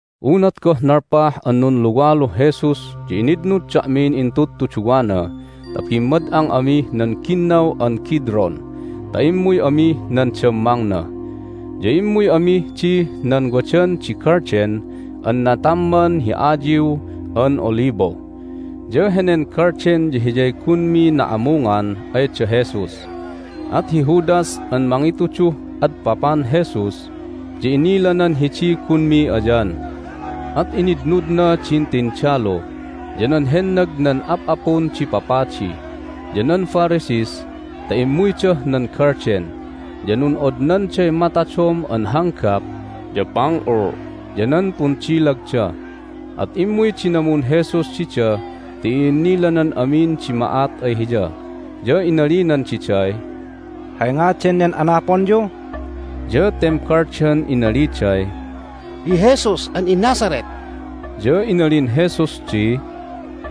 Unat goh nalpah an nunluwaluh Jesus ya initnud da'min intudtuduwana ta bimmad'ang amih nan Ginnaw an Kidron ta immuy amih nan dammangna. Ya immuy amih dih nan wadan di galden an natamman hi ayiw an olibo. Ya henen galden ya hiyay gunmi na'amungan ay da Jesus, at hi Judas an mangituduh adpapan Jesus ya inilanan hidiy gunmi ayan. At initnudna din tindalu, ya nan hennag nan ap'apun di papadi, ya nan Pharisees ta immuydah nan galden. Ya nun'odnanday matadom an hanggap, ya panul, ya nan pundilagda. At immuy dinamun Jesus dida ti i'innilanan amin di ma'at ay Hiya, ya inalinan diday, "Hay ngadan nen anaponyu?" Ya tembaldan inaliday, "Hi Jesus an iNazareth." Ya inalin Jesus di,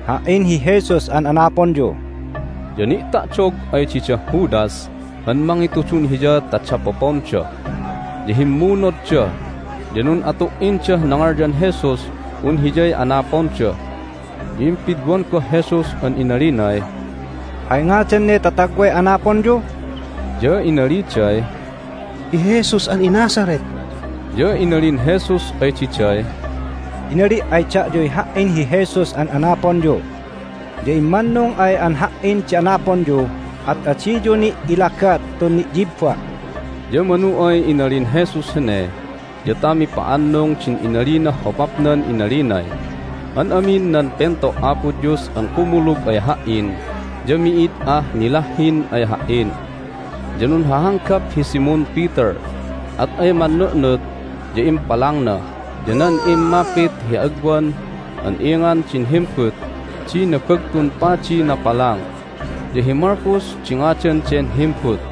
"Ha"in hi Jesus an anaponyu." Ya ni'ta'dog ay didah Judas an mangitudun Hiya ta dapoponda. Ya himmunodda, ya nun'atu"indah nangalyan Jesus un Hiyay anaponda. Ya impidwan goh Jesus an inalinay, "Hay ngadan ne tatagway anaponyu?" Ya inaliday, "Hi Jesus an iNazareth." Ya inalin Jesus ay diday, "Inali' ay da'yuy Ha"in hi Jesus an anaponyu. Ya immannung ay an Ha"in di anaponyu at adiyu ni' ilagat tun ni'yibba'." Ya manu ay inalin Jesus hene ya ta mipa'annung din inalinah hopapnan inalinay, "An amin nan pento' Apo Dios an kumulug ay Ha"in ya mi'id ah nilahhin ay Ha"in." Ya nunhahanggap hi Simon Peter, at ay mannu'nut ya impalangna, ya nan immapit hi agwan an ingan din himbut di Nabagtun Padiy napalang. Ya hi Malchus di ngadan den himbut.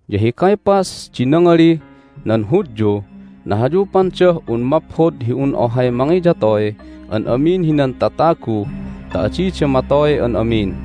Ya hi Caiaphas din nangalih nan Hudyuh nahayupandah un maphod hi un ohay mangiyatoy an amin hinan tatagu ta adida matoy an amin.)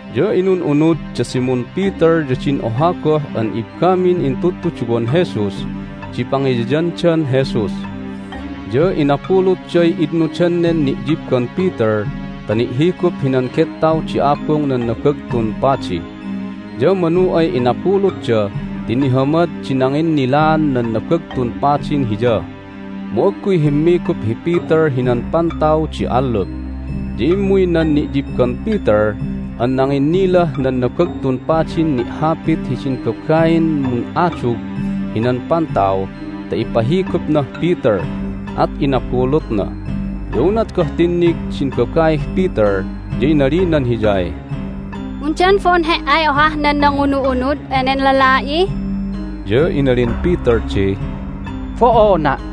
Ya inun'unud da Simon Peter ya din oha goh an ibbamin intudtuduwan Jesus di pangiyayandan Jesus. Ya inabulutday itnudan nen ni'yibban Peter ta ni'higup hinan gettaw di abung nan Nabagtun Padi, ya manu ay inabulutda ti nihamad di nanginnilaan nan Nabagtun Padin hiya. Mu agguy himmigup hi Peter hinan pantaw di allup. Ya immuy nan ni'yibban Peter an nanginnilah nan Nabagtun Padin ni'hapit hidin babain mun'adug hinan pantaw ta ipahigupnah Peter, at inabulutna. Ya unat goh tinnig din babaih Peter ya inalinan hiyay, "Undan bo'on he"ay ohah nan nangunu'unud enen lala'i?" Ya inalin Peter di, "Bo'ona'!"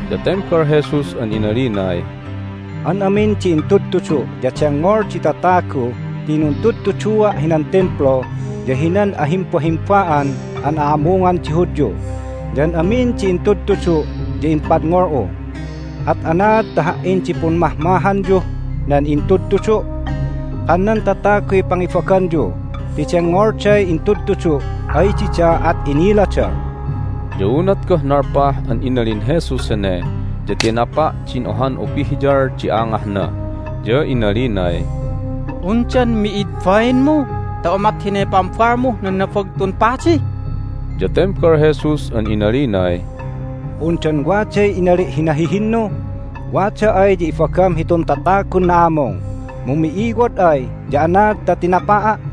Ya tembal Jesus an inalinay, "An amin di intudtudu' ya dengngol di tatagu ti nuntudtudua' hinan Timplu ya hinan ahimbahimba'an an a'amungan di Hudyu, ya an amin di intudtudu' ya impadngol'u. At anaad ta Ha"in di pummahmahanyuh nan intudtudu'? Kan nan tataguy pangibaganyu ti dengngolday intudutudu' ay dida, at inilada." Ya unat goh nalpah an inalin Jesus hene ya tinapa' din ohan upihyal di angahna, ya inalinay, "Undan mi'id bainmu ta umat hinay pambalmuh nan Nabagtun Padi?" Ya tembal Jesus an inalinay, "Undan waday inali' hi nahihinnu? Wada ay ya ibagam hitun tatagun na'amung, mu mi'iwod ay ya anaad ta tinapa'a'?"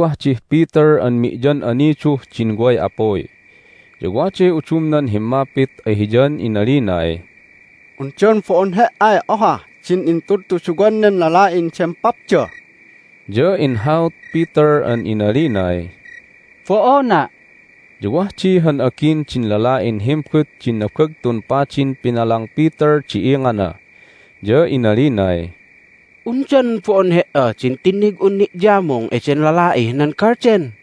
Wagwah dih Peter an mi'yan'aniduh din way apuy. Ya waday udumnan himmapit ay hiyan inalinay, "Undan bo'on he"ay ohah din intudtuduwan nen lala'in dempapda?" Ya inhaut Peter an inalinay, "Bo'ona'!" Ya wah di han agin din lala'in himbut din Nabagtun Padin pinalang Peter di ingana, ya inalinay, "Undan bo'on he"a din tinnig'un ni'yamung eden lala'ih nan galden?"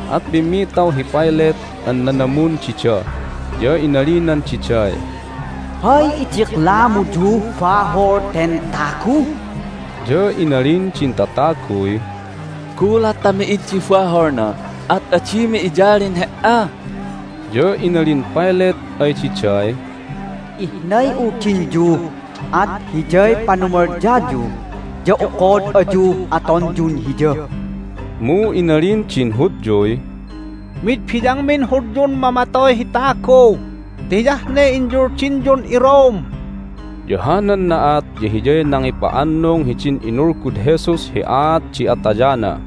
At pimmitaw hi Pilate an nanamun dida, ya inalinan diday, "Hay idiklamuyuh bahol ten tagu?" Ya inalin din tataguy, "Gulat ta mi'id di baholna at adimi iyalin he"a!" Ya inalin Pilate ay diday, "Ihnay uldinyu, at hiyay panumalyayu, ya okod ayuh atonyun Hiya." Mu inalin din Hudyuy, "Mid biyangmin Hudyun mamatoy hi tagu ti hiyah ne inyuldinyun iRome!" Ya hanan na'at ya hiyay nangipa'annung hidin inulgud Jesus hi aat di atayana.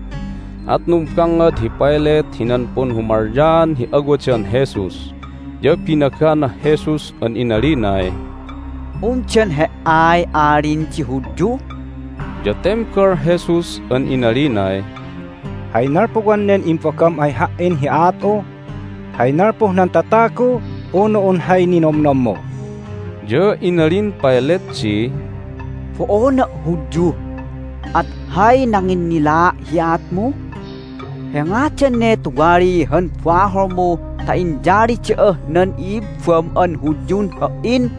At numbangngad hi Pilate hinan punhumalyaan hi awadan Jesus, ya binaganah Jesus an inalinay, "Undan He"ay Alin di Hudyu?" Ya tembal Jesus an inalinay, "Hay nalpuwan nen imbagam ay Ha"in hi aat'u? Hay nalpuh nan tatagu unu un hay ninomnommu?" Ya inalin Pilate di, "Bo'ona' Hudyu, at hay nanginnilaa' hi aatmu? Hay ngadan ne tuwali han baholmu ta inyali da'ah nan i'ibbam an Hudyun ha"in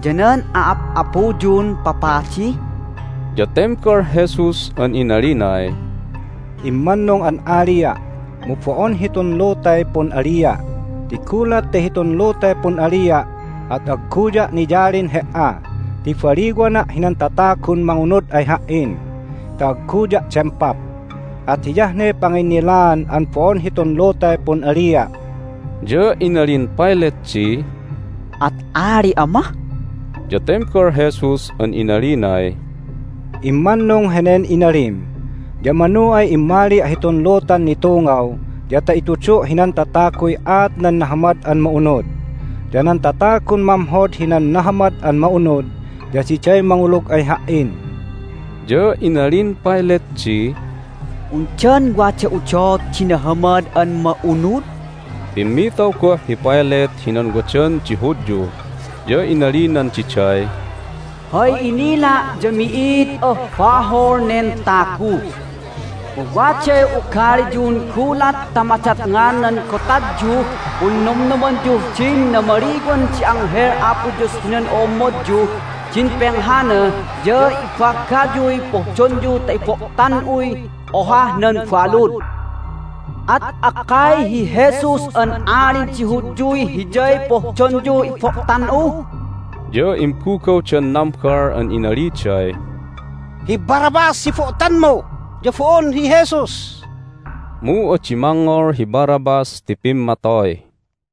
ya nan a'ap'apuyun papadi?" Ya tembal Jesus an inalinay, "Immannung an alia', mu bo'on hitun lutay pun'alia'. Ti gulat ta hitun lutay pun'alia' at agguya' niyalin he"a ti baliwana' hinan tatagun mangunud ay Ha"in ta agguya' dempap. At hiyah ne panginnilaan an bo'on hitun lutay pun'alia'." Ya inalin Pilate di, "At ali'a mah?" Ya tembal Jesus an inalinay, "Immannung henen inalim. Ya manu ay immalia' hitun lutan nitungaw ya ta itudu' hinan tataguy aat nan Nahamad an Ma'unud. Ya nan tatagun mamhod hinan Nahamad an Ma'unud ya diday mangulug ay Ha"in." Ya inalin Pilate di, "Undan wada udot di Nahamad an Ma'unud?" Hay Nanumalyaandan Jesus hi Pamatayandan Hiya Pimmitaw goh hi Pilate hinan wadan di Hudyu, ya inalinan diday, "Hay inila' ya mi'id ah bahol nen tagu! Mu waday ugaliyun gulat ta madatngan nan Gotadyuh Punnomnomanyuh din Namaliwan di Anghel Apo Dios hinan O'ommodyuh din Penghana ya ibagayuy pohdonyu ta ibo'tan'uy ohah nan balud. At akkay hi Jesus an Alin di Hudyuy Hiyay pohdonyuh ibo'tan'u?" Ya imbugawdan nambal an inaliday, "Hi Barabbas di ibo'tanmu, ya bo'on hi Jesus!" Mu adi mangngol hi Barabbas ti pimmatoy.